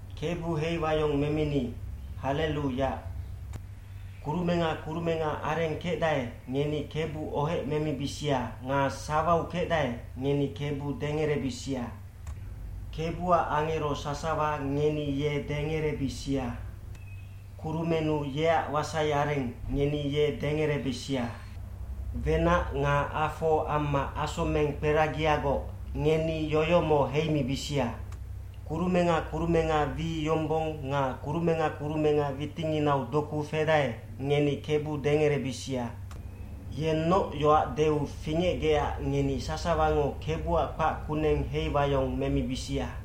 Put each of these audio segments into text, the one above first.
Kebu heiwayong memini, hallelu Yac. Kurumenga kurumenga areng kecdae, ngeni Kebu ohec memibisia nga sawau kecdae, ngeni Kebu dengerebisia. Kebuac angero sasawa ngeni ye dengerebisia. Kurumennu yeac wasai areng, ngeni ye dengerebisia. Wenac nga afo amma asomeng kperagiagoc, ngeni yoyomo heimibisia. Kurumenga kurumenga wi yombong nga kurumenga kurumenga witinginau doku fedae, ngeni Kebu dengerebisia. Yennoc yoac deu fingecgecac ngeni sasawango Kebuac kpac kuneng heiwayong memibisia.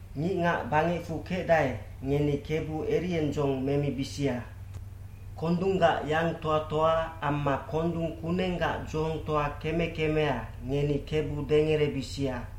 Ngicngac bangecfu kecdae, ngeni Kebu eriendzong memibisia. Kondunggac yangtoatoa amma kondung kunenggac dzohongtoa keme kemea, ngeni Kebu dengerebisia.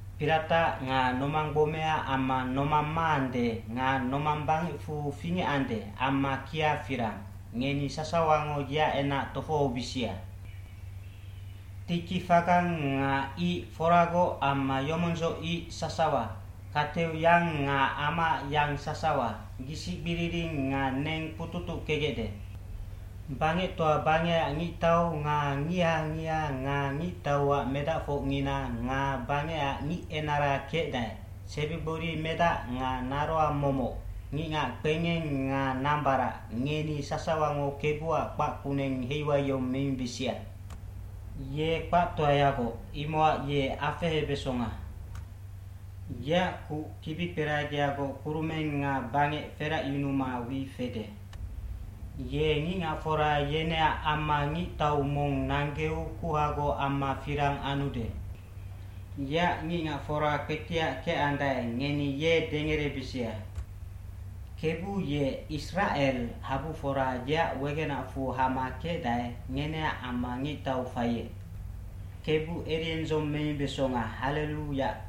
Piratac nga nomanggbomea amma nomang maande nga nomang bangecfu fingecande amma kia firang, ngeni sasawango yeac enac tofohobisia. Tiki fagang nga ic foragoc amma yomondzoc ic sasawa, kateu yang nga amaac yang sasawa, gisicgbiriring nga neng kpututuckegecde. Bangectoa bangecac ngictau nga ngiha ngiha nga ngictauac medacfocngina nga bangecac ngicenara kecdae, sebigbori medac nga naroang momoc, ngicngac kpengeng nga nambarac, ngeni sasawango Kebuac kpac kuneng heiwayong memibisia. Ye kpactoayagoc, imocac ye afehebesonga. Yeac kuc kibikperagiagoc kurumeng nga bangec feracyunuma wi fede. Ye ngicngacfora yeneac amma ngictau mong nanggeu kuhagoc amma firang anude. Yeac ngicngacfora kpetiac kecandae, ngeni ye dengerebisia. Kebu ye Isracel habufora yeac wegenacfu hama kecdae, ngeneac amma ngictau faiec. Kebu eriendzong memibesonga, hallelu Yac.